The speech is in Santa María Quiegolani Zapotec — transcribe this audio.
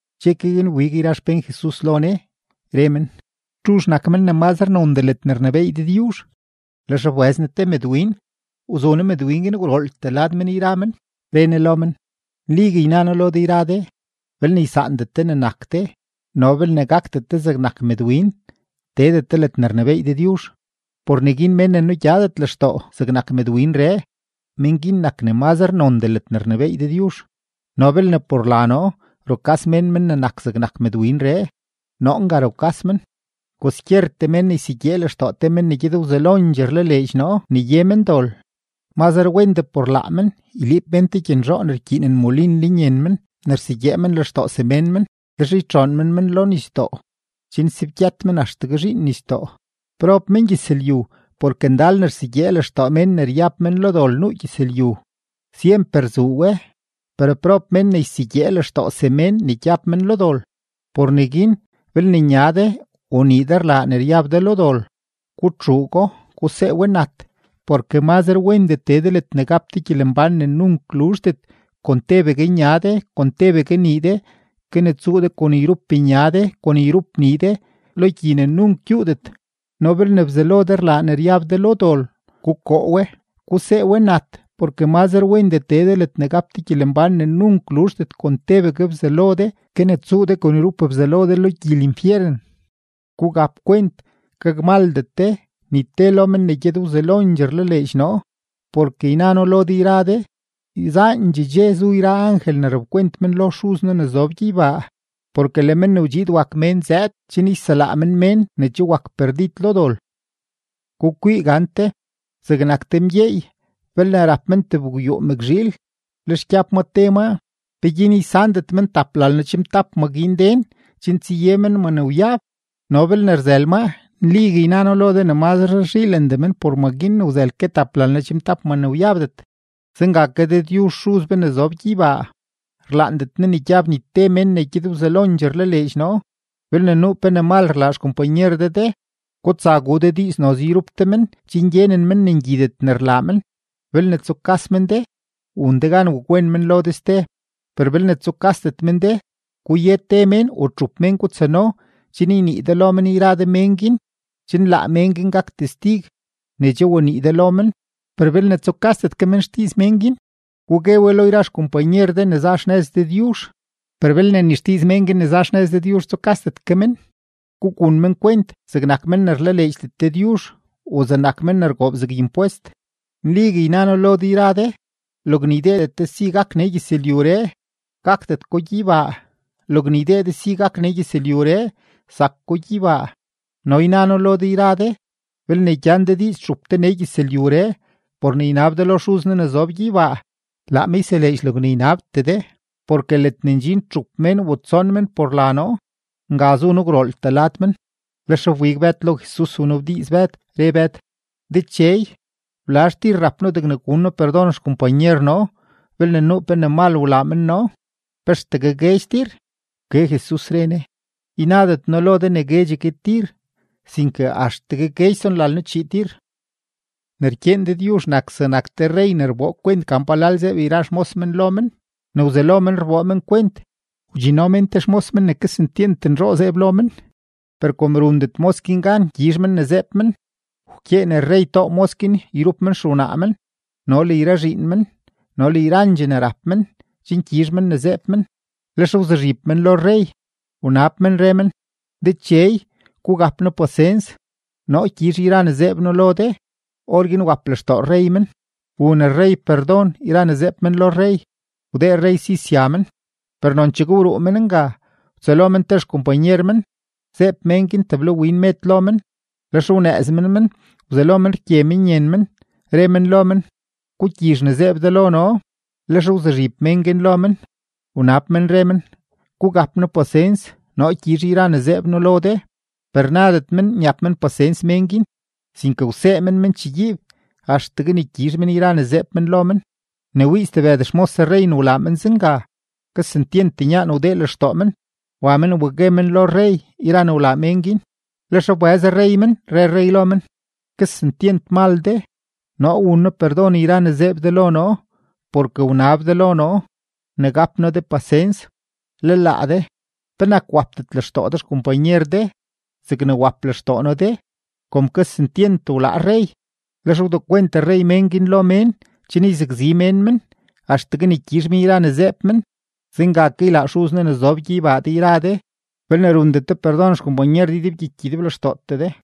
Dxe ke guin wbig yra xpén Jesus lo Ne, re men: ―¿Txuzh nak men ne mazre nondee ledne rnebééy Dëdyuzh? Lex wbëz Ne te mëdwin, wzu Ne mëdwin guin gwrooltee lad men yra men, re Ne lo men: ―Nligue yna noo lo de yra de, belne ysaandet de ne nak de no belne gakdet de zegnak mëdwin, teedet de ledne rnebééy Dëdyuzh. Por neguin mén ne nugyadet lextoo zegnak mëdwinree, mén guin nak ne mazre nondee ledne rnebééy Dëdyuzh. No belne por la noo rukas mén men ne nak zegnak mëdwinree, noo nga rukas men. ’Kwaskyertee mén ne ysegyee lextoo te men ne gyed wzelondxee rlaleedx noo ne ye men dol, mazre wendee por laa men yliib mén te gyenzhoo ne rkyiinen molin lenyen men ne rsegyee men lextoo semén men, lex ytxoon mén men lo nisdoo chen sebgyët men axtegue zhiin nisdoo. Prob mengyëzlyu porke ndal ne rsegyee lextoo mén ne ryab men lo dol nuu gyëzlyu, syemper zuu we, per prob mén ne ysegyee lextoo semén ne gyab men lo dol. ’Por neguin belne nya de o nii de rlaa ne ryab de lo dol, gutxuugo, gusee we nat. Porke mazre wendee tee de ledne gap de gyelembán ne nunk luzhdet kon tebegue nya de, kon tebegue nii de, ke ne tsuu de kon yrup nya de, kon yrup nii de lo gyi ne nunk gyuudet. No belne bzalo de rlaa ne ryab de lo dol, gukoo we, gusee we nat. Porke mazre wendee tee de ledne gap de gyelembán ne nunk luzhdet kon tebegue bzalo de, ke ne tsuu de kon yrup bzalo de lo gyi linfyeren. ’Gugap kwent, gakmaldet de ni te lo men ne gyed wzelondxee rlaleedx noo. Porke yna noo lo de yra de, yzaandxee dxe zu yra angel ne rapkwent men lo Xuz noo ne zob gyeybaa. Porke le Men ne wdxiid wak Mén zëëd chen yselaa men mén ne che wak perdid lo dol. ’Gukwii gante, zegnak te mgyeey, belne rap men tebgwyuu mëkzhiil, lex gyab ma te maa. ¿Peguin ysandet men taplalno-chimtap ma guin den chen tsaye men ma ne wyab? No belne rzël maa, nligue yna noo lo de ne mazre rzhiilendee men por ma guin ne wzël ke taplalno-chimtap ma ne wyabdet. Zenga ke Dëdyuzh Xuz be ne zob gyeybaa, rlaandet Ne ne gyab ni te men ne gyed wzelondxee rlaleedx noo. ’Belne nuu pe ne mal rlaa xkompanyer de de, gutsa gu de diiz noze yrup de men chen gyenen men ne ngyidet ne rlaa men. Belne tsukas men de, wun de gan wakwen men lo de ste. Per belne tsukasdet men de, guye te mén o txup mén gutsano chen ynii de lo men yra de mén guin, chen laa mén guin gak testig ne che wanii de lo men. Per belne tsukasdet ke men xdiiz mén guin, gugue we lo yra xkompanyer de ne za xnëz Dëdyuzh; per belne ni xdiiz men guin ne za xnëz Dëdyuzh tsukasdet ke men, gugun men kwent zegnak men ne rlaleedxdet Dëdyuzh o zegnak men ne rgoob zeg impwest. ’Nligue yna noo lo de yra de, logne ydeedet de si gak nee gyëzlyuree, gakdet ko gyeybaa; logne ydee de si gak nee gyëzlyuree, zak ko gyeybaa. ’No yna noo lo de yra de, belne gyan de diiz txup de nee gyëzlyuree por ne ynab de lo Xuz noo ne zob gyeybaa, laa me yseleedx logne ynabtee de. Porke ledne ndxin txup mén o tson mén por la noo, nga zu noo gwrooltee lad men. Lex wbig Bëd lo Jesus wnabdiiz Bëd, re Bëd: ―Dechey, ¿blazh tir rap noo degne gun noo perdon xkompanyer noo belne nuu pe ne mal rlaa men noo? ¿Pe axtegue guedx tir? Wke Jesus, re Ne: ―Ynadet noo ne guedxegue tir, sinke axtegue guedx tsonlalno-chii tir. ’Ne rkyeen Dëdyuzh nak zegnak te rrey ne rboo kwent gan palal zeeb yra xmos men lo men. Ne wzelo men rboo men kwent, wdxinno mén te xmos men ne kesentyent nzhoo zeeb lo men. Per kom rundet mos guin gan gyizh men ne zeeb men, wkyeen rrey too mos guin yrup men xewnaa men no le yra zhiin men no le yrandxee ne rap men chen guezh ne zeeb men. Lex wzuzhib men lo rrey, wnab men, re men: “Dechey, gugap noo pasens, noo gyizh yra ne zeeb noo lo de.” Orguin wap lextoo rrey men, wun rrey perdon yra ne zeeb men lo rrey, wdee rrey si sya men. Per nonchegue wruu men nga, wtsëlo men te xkompanyer men, zeeb mén guin teblawin med lo men. Lex wnëëz men men wzelo men rgye men yen men, re men lo men: “¡Gugyizh ne zeeb de lo noo!” Lex wzuzhib mén guin lo men, wnab men, re men: “Gugap noo pasens, noo gyizh yra ne zeeb noo lo de.” Per nadet men nyap men pasens mén guin, sinke wsee men men chegyiib axtegue ne gyizh men yra ne zeeb men lo men. Ne wii stebëd xmos rrey ne wlaa men zenga, kesentyent nyaan wdee lextoo men; wa men wa gue men lo rrey yra ne wlaa mén guin. Lex wbëz rrey men, re rrey lo men: “¡Kesentyent mal de! Noo wun noo perdon yra ne zeeb de lo noo, porke wnab de lo noo ne gap noo de pasens. Le laa de, ¿penak wapdet lextoo de xkompanyer de zegne wap lextoo noo de?” Kom kesentyent wlaa rrey, lex wdekwent rrey mén guin lo mén chen yzakzi mén men axtegue ne gyizh men yra ne zeeb men. Zenga ke ylaa Xuz noo ne zob gyeybaa de yra de belne rundet de perdon xkompanyer de ydebgyiky ydeblextootee de.